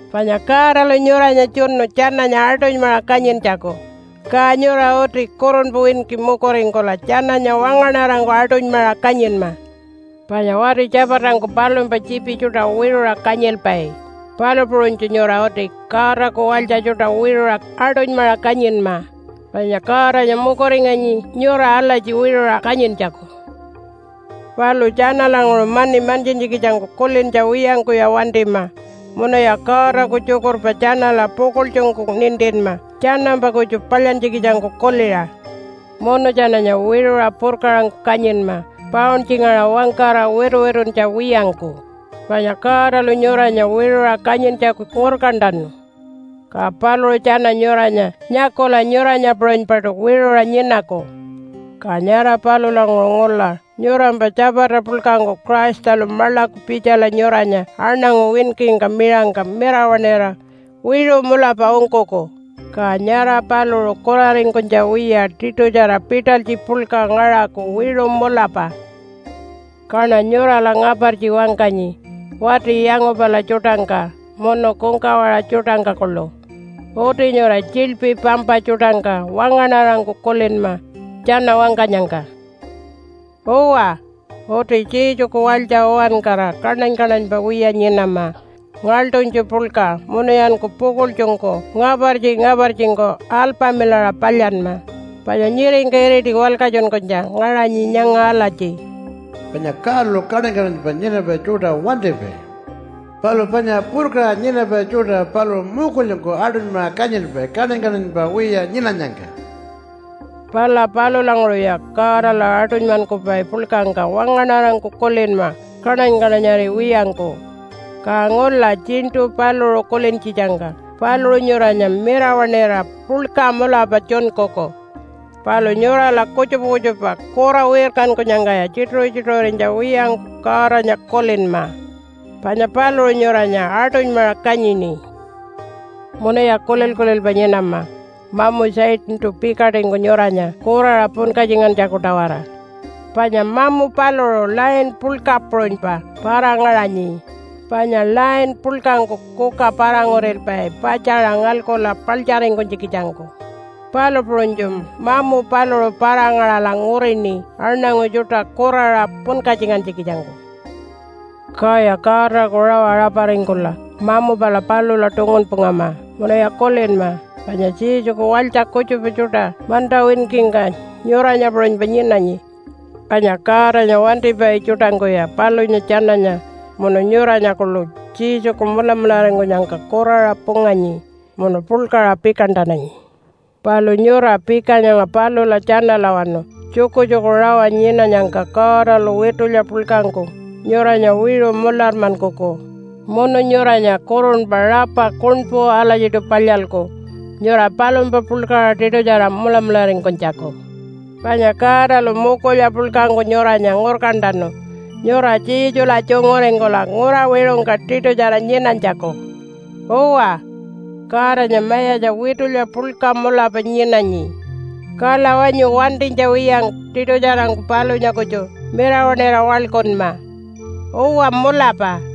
Panya Godalu nyuranya tjunu tjananya aṯunymaṟa kanyintjaku. Ka nyura uti kurunpa winki mukuringkula tjananya wangaṉarangku aṯunymaṟa kanyinma. Panya wati tjapatangku palumpa tjiipi tjuṯa wiṟuṟa kanyilpai, palu puṟunytju nyura uti Godaku walytja tjuṯa wiṟuṟa aṯunymaṟa kanyinma, panya Godanya mukuringanyi nyura alatji wiṟuṟa kanyintjaku. Palu tjanalanguṟu mani mantjintjikitjangku kulintja wiyangkuya wantima munuya Godaku tjukurpa tjanala pukuḻtjungku nintinma tjanampa kutju palyantjikitjangku kuliṟa. Munu tjananya wiṟuṟa purkaṟangku kanyinma pauntjingaṟa wangkara wituwituntja wiyangku, panya Godalu nyuranya wiṟuṟa kanyintjaku ngurkantanu. Ka paluṟu tjana nyuranya nyakula nyuranya puṟunypaṯu wiṟuṟa nyinaku. Ka nyara palulanguṟu ngula nyurampa tjapata puḻkangku Christalu maḻaku pitjala nyuranya aṉangu winkingka miṟangka mirawaṉira wiṟu mulapa ungkuku. Ka nyara paluṟu kuraringkunytja wiya tiṯutjara pitalytji puḻka ngaṟaku wiṟu mulapa. Kaṉa nyurala ngapartji wangkanyi wati yangupala tjuṯangka munu kungkawaṟa tjuṯangka kuḻu. Uti nyura tjiḻpi pampa tjuṯangka wangaṉarangku kulinma tjana wangkanyangka. Uwa, uti Jesuku walytja uwankara kaṉany-kaṉanypa wiya nyinama ngaḻṯunytju puḻka. Munuyanku pukuḻtjungku ngapartji-ngapartjingku alpamilaṟa palyanma, panya nyiringka iriti walkatjunkunytja ngaṟanyi nyanga alatji, “Panya Godalu kaṉany-kaṉanypa nyinapai tjuṯa wantipai. Palu panya purkaṟa nyinapai tjuṯa paluṟu mukulyangku aṯunymaṟa kanyilpai kaṉany-kaṉanypa wiya nyinanyangka.” Pala palulanguṟuya Godala aṯunymankupai puḻkangka wangaṉarangku kulinma kaṉany-kaṉanyariwiyangku, ka ngula tjiṉṯu paluṟu kulintjitjangka paluṟu nyuranya mirawaṉira puḻka mulapa tjunkuku. Palu nyurala kutjupa kutjupa kura wirkankunyangkaya tjituṟu-tjituṟurinytja wiyangku Godanya kulinma, panya paluṟu nyuranya aṯunymaṟa kanyini. Munuya kulil-kulilpa nyinama mamu Satantu pikaṯingku nyuranya kuraṟa punkatjingantjaku-tawara. Panya mamu paluṟu lion puḻka puṟunypa para-ngaṟanyi, panya lion puḻkangku kuka para-ngurilpai patjaṟa ngalkula paḻtjaringkunytjikitjangku, palu puṟunytju mamu paluṟu para-ngaṟala ngurini aṉangu tjuṯa kuraṟa punkatjingantjikitjangku. Kaya Godaku rawa raparingkula mamu pala palula tungunpungama. Munuya kulinma panya Jesuku walytja kutjupa tjuṯa manta winkingka nyuranya puṟunypa nyinanyi, panya Godanya wantipai tjuṯangkuya palunya tjananya munu nyuranya kuḻu Jesuku mulamularingkunyangka kuraṟa punganyi munu puḻkaṟa pikantananyi. Palu nyura pika nyanga palula tjanalawanu tjukutjuku rawa nyinanyangka Godalu witulya puḻkangku nyuranya wiṟu mularmankuku munu nyuranya kurunpa rapa kuṉpu alatjiṯu palyalku nyura palumpa puḻkaṟa tiṯutjara mulamularingkunytjaku. Panya Godalu mukulya puḻkangku nyuranya ngurkantanu nyura Jesula tjunguringkula ngura wiṟungka tiṯutjara nyinanytjaku. Uwa, Godanya mayatja witulya puḻka mulapa nyinanyi. Kala wanyu wantinytja wiyangku tiṯutjarangku palunya kutju mirawaṉira waḻkunma. Uwa, mulapa.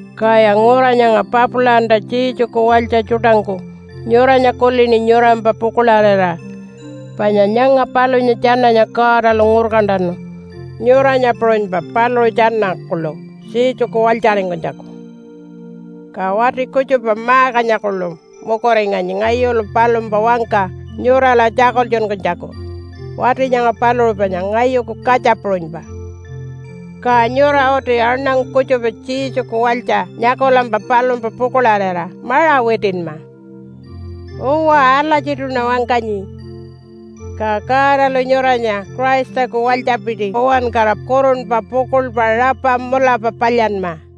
Kaya ngura nyanga Papilanta Jesuku walytja tjuṯangku nyuranya kulini nyurampa pukuḻarira. Panya nyanga palunya tjananya Godalu ngurkantanu nyuranya puṟunypa paluṟu tjana kuḻu Jesuku walytjaringkunytjaku. Ka wati kutjupa Markanya kuḻu mukuringanyi ngayulu palumpa wangka nyurala tjakultjunkunytjaku. Wati nyanga paluṟu panya ngayuku katja puṟunypa. Ka nyura uti aṉangu kutjupa Jesuku walytja nyakulampa palumpa pukuḻarira maṟa witinma. Uwa, alatjiṯuṉa wangkanyi. Ka Godalu nyuranya Christaku walytjapiti uwankara kurunpa pukuḻpa rapa mulapa palyanma.